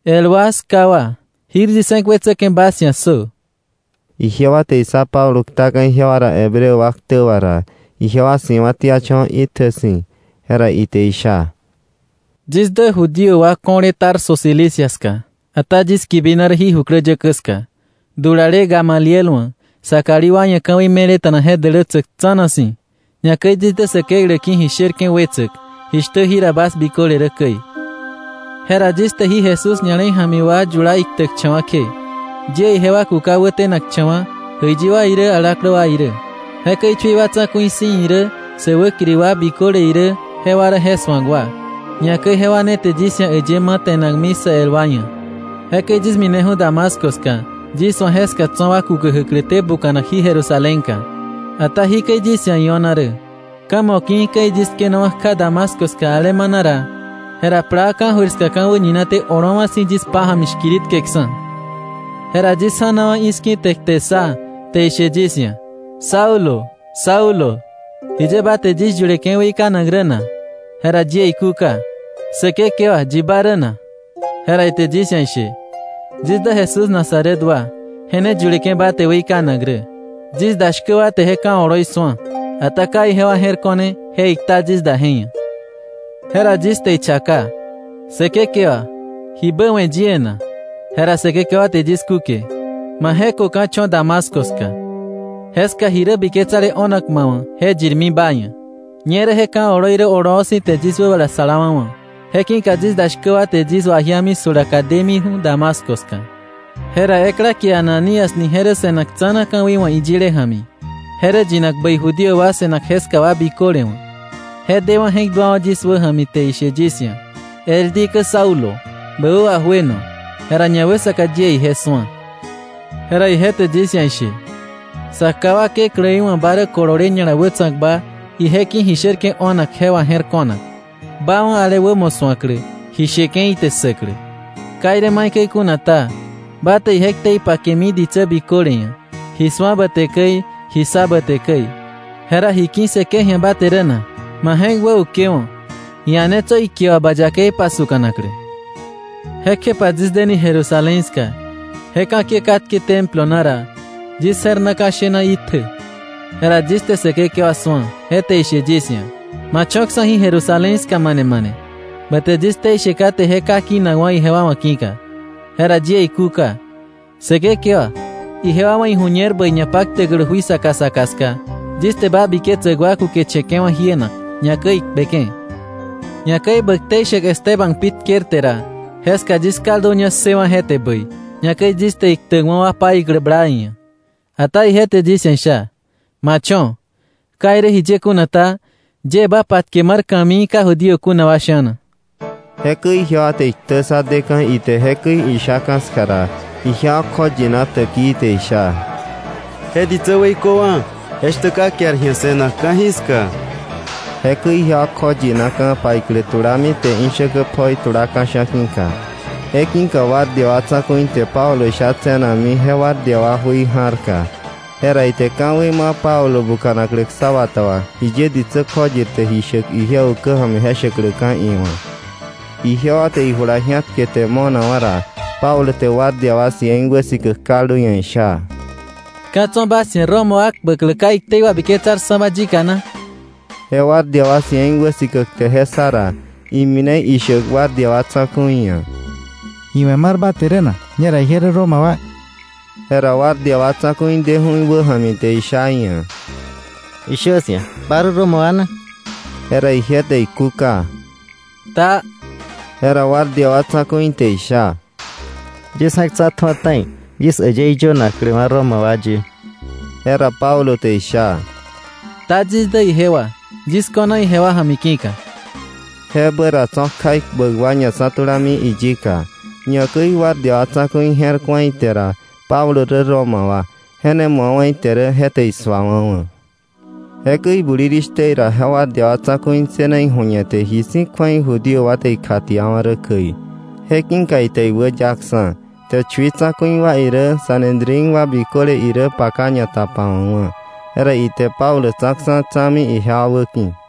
“El wa, 'ská wa, jir yis je̱k wetsäke̱ bas ia̱ ssö.” Ijewa te issá Pablo ktaka̱ ijewa ra Hebreo wa ktä wà ra, ijewa si̱wa̱tiacha̱wa̱ itjä si̱. Jera ite isha: “Yis dä Judío wa ko̱le Tarso Cilicia ska, ata yis kibina rä jí jukläyäkä ska, dulale Gamaliel wa̱, sa kalí wa ia̱ ka̱wei me̱leta̱na je dälätsäk tsa̱na si̱. Ñakäi yis dä Säkeklä ki̱ ji sherke̱ wetsäk, jishtä jira bas biköle rä käi. Jera yis te jí Jesús ña̱le̱i ja̱mi wa yula iktäkcha̱wa̱ kje, yie ijewa kuka wätenakcha̱wa̱ jäiyi wa irä alaklä wa irä. Jekäi chui wa tsa̱ku̱i si̱ irä sä wäkiri wa biköle irä jewa rä je su̱ak wa. Ñakäi jewa ne te yis ia̱ äyë ma̱ te̱nakmi sa el wa ia̱. Jekäi yis mineju̱ Damasco ska yis wa̱ jeska tso̱ wa kukä jäkläté buka̱nak jí Jerusalénka. “Ata jikäi yis ia̱ io̱na rä. Ka̱ moki̱ käi yis tkenawa̱ kja Damasco ska alemana ra, jera plaa ka̱jöir ska ka̱ wäñinaté olowa̱ si̱ yis pája̱mi shkiritkeksa̱. Jera yis ja̱nawa̱ i̱ski̱, te kte ssa, te ishe yis ia̱: “Saulo, Saulo, ¿jiye ba te yis yuleke̱ weikanak rä na?” Jera yie ikúka: “Säkekewa, ¿yi ba rä na?” Jera ite yis ia̱ ishe: “Yis dä Jesús Nazaret wa, je ne yuleke̱ ba te weikanak rä.” Yis da shkä wa te je ka̱ oloi su̱a, ata ka ijewa je̱r ko̱ne je ikta yis da je ia̱. Jera yis te ichaka: ‘Säkekewa, ¿jibä we̱ yie na?’ Jera Säkekewa te yis kúke: ‘Ma je̱köka̱ cho̱ Damasco ska. Jeska ji rä biketsale o̱nak ma wa̱ je yirmi ba ia̱.” Ñerä je ka̱ oloi rä oloo si̱ te yis wäbala salawa̱wa̱. Je ki̱ka yis da shkä wa te yis wajiami 'sjulaka demiju̱ Damasco ska. “Jera ekla kie Ananías ni je rä se̱nak tsa̱na ka̱wei wa̱ iyile ja̱mi. Je rä yinak bäi Judío wa se̱nak jeska wa biköle wa̱. Je dewa̱ je̱k duawa̱ yis wäja̱mi, te ishe yis ia̱: “El dikä Saulo, bä wä wajueno.” Jera ñawäsaka yie ije su̱a. Jera ije te yis ia̱ ishe: ‘Sa ká wa Kekläí wa̱ ba rä kolole ña̱la wätsa̱kba ije ki̱ ji sherke̱ o̱nak je wà je̱r ko̱nak, ba wa̱ ale wämo su̱aklä, ji sheke̱ ite ssäklä. Ka irä maikäi kuna ta, ba te ije ktei pakemi ditsä biköle ia̱, ji su̱a ba te käi, ji ssa ba te käi. Jera, ¿ji ki̱ssëke̱ ji̱a ba te rä na? Ma je̱k wäukewo̱, ia̱netsö ikie wà ba yakei pasuka̱naklä.” “Jekjepa yis deni Jerusalén ska, je ka̱kiä katke Templo na ra, yis je̱r na ka̱ shena itjä. Jera yis te Säkekewa su̱a, je te ishe yis ia̱: ‘Ma cho̱ksa̱ jí Jerusalén ska mane mane, ba te yis ktei she kate je ka kinakwa̱ ijewa wa̱ ki̱ka.’ Jera yie ikúka: ‘Säkekewa, ijewa wa̱ iju̱ñer bäi ñapaktäklä jui saka saka ska yis te ba biketsäk wa kukeche̱ke̱wa̱ jienak, ñakäi ikpeke̱, ñakäi bä ktei shäk Esteban pi tkerte ra, jeska yis kalduña ssëwa̱ je te bäi, ñakäi yis te iktäkwa̱ wa paiklä bla iia̱.’ Ata ije te yis ia̱ isha: ‘Ma cho̱. Ka irä jiye kuna ta, yie ba patke mar ka̱mii ka Judío kuna wa sha̱na.” Jekäi ijewa te iktä ssa deka̱ ite jekäi ishaka̱ ska ra, ijewa kjoyina täkii te isha: —Je ditsä weiköwa̱, je shtä ka kiar ji̱a se̱nak ka̱jiska. Jekäi ikjoyinaka̱, ipaiklä tulami, ijewa te ishäkä pjoi tula ka̱sha̱ ki̱ka. Je ki̱ka guardia wa tsa̱ku̱i te Pablo sha tse̱nakmi je guardia wa jui ja̱rka. Jera ite ka̱wei ma Pablo buka̱naklä ksá bata wà, jiye ditsä kjoyirte ji shäk ije ukä ja̱mi je shäkläka̱ iwa̱. Ijewa te ijula ji̱atkete mo̱nakwa̱ ra, Pablo te guardia wa cien wäsikäk kaldu ia̱ isha: —¿Ka̱ tso̱ bas ia̱ Roma wa kpäklä ka iktei wabiketsarksa̱ba yika na? Je guardia wa cien wäsikäk te je ssa ra, imine ishäk guardia wa tsa̱ku̱i ia̱: —¿Ji we̱ mar ba te rä na? Ñera ije rä Roma wa. Jera guardia wa tsa̱ku̱i deju̱ iwäja̱mi te isha iia̱: —Ishö 'sia̱ ¿ba rä Roma wa na? Jera ije te ikúka: —Taa. Jera guardia wa tsa̱ku̱i te isha: —Yis je̱k tsa̱tju̱a ta̱i, yis äyëí yönakläwa̱ Roma wa ye. Jera Pablo te isha: —Ta yis dä ijewa, yis ko̱na ijewa ja̱mi ki̱ka. Jebä ra tso̱ kja ikpäk wa ñatsa̱tulami iyika. Ñakäi guardia wa tsa̱ku̱i je̱r ku̱a ite ra Pablo rä Roma wa, je ne mu̱awa̱ ite rä, je te isuawa̱wa̱. Jekäi bulirishtä ra je guardia wa tsa̱ku̱i ssëna iju̱ñete ji si̱ kju̱ei Judío wa te ikjatiawa̱ rä käi. Je ki̱ka ite iwäyaksa̱, te chui tsa̱ku̱i wa irä Sanedrín wa biköle irä paka ñatapawa̱kwa̱. Jera ite Pablo tsa̱ksa̱, tsa̱mi ijewa wäki̱.